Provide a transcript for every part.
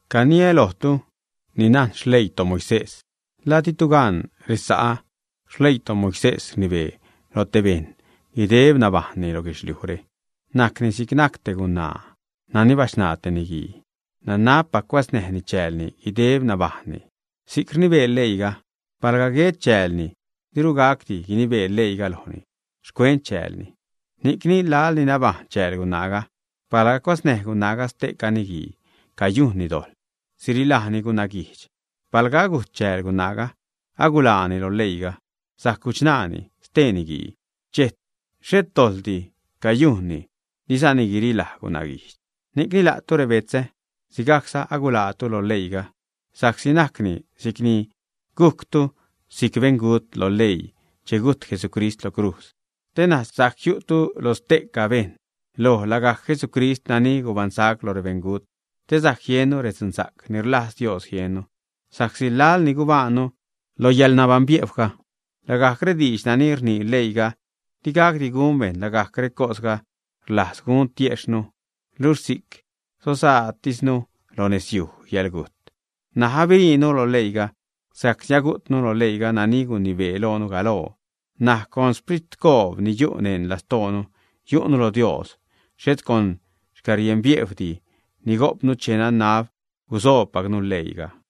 Caniä lojtu ni najn xleii toMoisés. ¿La ditu gan, resa'ä, xleii toMoisés rnibee loj te bejṉ guideb nabajṉni lo guedxlijre? Najcni si'c te gunaa nani bachṉaa te niguii. Nanabpac cuäznäjni chäälni guideb nabajṉni. Si'c rnibee leiiga. Palga guet chäälni, diru gacdi guinibee leiiga lojni xcuent chäälni. Ni'cni, laḻ ni nabajṉ chääl gunaaga, palga cuäznäj gunaaga ste'ca niguii, cayujnni dojḻ sirilajni gunaguijdx. Palga agujt chääl gunaaga, aguḻaani lo leiiga, sajc guchṉaani stee niguii, xhet dojḻdi cayujnni, dizani guirilaj gunaguijdx. Ni'cni la'tu, rebetzä, sigajcza aguḻaatu lo leiiga, sa'csi najcni si'cni gujctu si'c beṉgut lo leii che gujt Jesucrist lo crujz, te ṉaj sajc jiu'tu lo ste'ca bejṉ, loj lagajc Jesucrist nani gubaṉsac loj rebeṉgut te sajc jiennu redzunsa'c ni rlajz Dios jiennu. Sa'csi laḻ ni gubajṉnu lo yäḻnabaṉbiejwga, lagajc rediidx nani rnii leiiga di gacdi gun bejṉ, lagajc recosga rlajz gun tiejxhnu, luxh si'c sozaatisnu lo xnezyuj yäḻgujt. N̲aj abiṟiinu lo leiiga, sa'csi agujtnu lo leiiga nani gunibee loonu galoo. N̲aj con xpritcoob ni yu' neṉ lastoonu yu'nu lo Dios, xhet con xcärienbiejwdi ni gojpnu che nanab gusoobpacnu leii.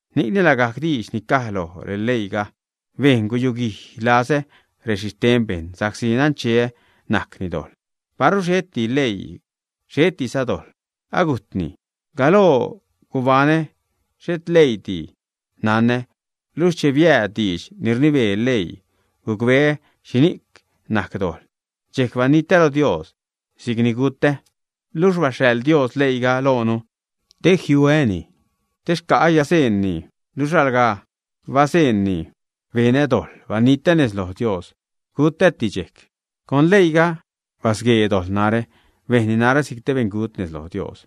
Ni'cni lagajc diidx ni caj lo leiiga bejn guyuguij lazä rexhixten bejṉ sa'csi nancheä najcni dojḻ. Paru xheti leii, xhetiza dojḻ, agujtni. Galoo gubaṉä xhet leiidi nanä, luxh che biääd diidx ni rnibee leii, gucbeä xhini'c najc dojḻ, dxejc banitä lo Dios, si'c ni gutä. Luxh baxhaḻ Dios leiiga loonu te jiuäni, te xca'ä yäḻnabajṉ, luxh alga bazeṉni benä dojḻ, banitä nez loj Dios, gutäti dxejc. Con leiiga, basguee dojḻ narä, bejnni narä si'c te beṉgut nez loj Dios.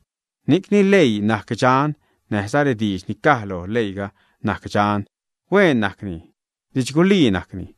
Ni'cni, leii najc dxan, näjza rediidx ni caj lo leiiga najc dxan; hueen najcni, didxgulii najcni.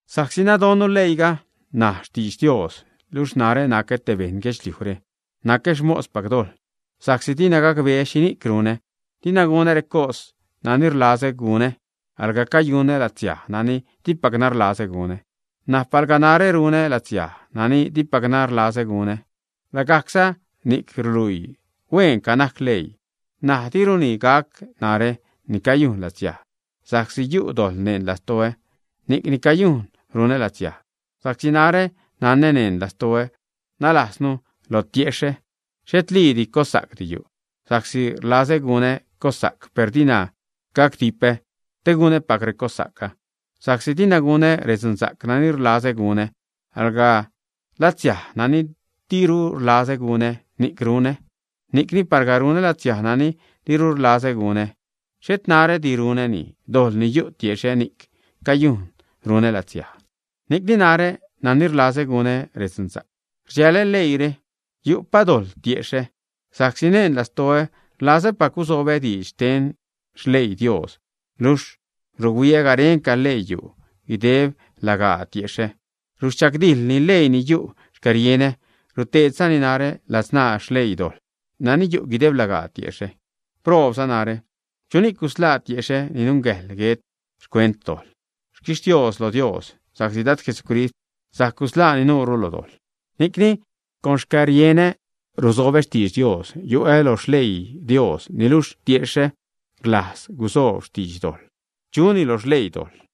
Sa'csi nadonnu leiiga najc xtidx Dios, luxh narä nacä te beṉ guedxliujre, nacä xmospac dojḻ. Sa'csi dina gacbeä xhini'c runä. Dina gunä recos nani rlazä gunä, alga cayunä latsiaj nani dipacna rlazä gunä. N̲aj palga narä runä latsiaj nani dipacna rlazä gunä, lagajcza ni'c ruluii hueenca najc leii. N̲aj, diruni gac narä ni cayujn latsiaj, sa'csi yu' dojḻ neṉ lastoä, ni'c ni cayujn runä latsiaj. Sa'csi narä nanä neṉ lastoä, nalajznu lo tiexhä, xhetliidi cossa'cdi yu'; sa'csi rlazä gunä cossa'c, per dina gacdipä te gunäpac recossa'cga. Sa'csi dina gunä redzunsa'c nani rlazä gunä, alga latsiaj nani diru rlazä gunä, ni'c runä. Ni'cni palga runä latsiaj nani diru rlazä gunä, xhet narädi runäni, dojḻ ni yu' tiexhä, ni'c ni cayujn runä latsiaj. Ni'cni narä, nani rlazä gunä redzunsa'c, rdxälä leiire: yu'pa dojḻ tiexhä. Sa'csi neṉ lastoä, rlazäpac gusobä diidx xten xleii Dios. Luxh ruhuiä garenca leii yu' guideb lagaa tiexhä, ruchagdijlni leii ni yu' xcärienä, ruteedzani narä ladzṉaa xleii dojḻ nani yu' guideb lagaa tiexhä. ¡Proobza narä! ¿Chuni'c gusḻaa tiexhä ni nungäjḻ guet xcuent dojḻ? ¡Xquixtios loj Dios sa'csi Dad Jesucrist sajc gusḻaa nuurnu lo dojḻ! Ni'cni con xcärienä rusobä xtiidx Dios, yu'ä lo xleii Dios, niluxh tiexhä rlajz gusoob xtiidx dojḻ, chuni lo xleii dojḻ.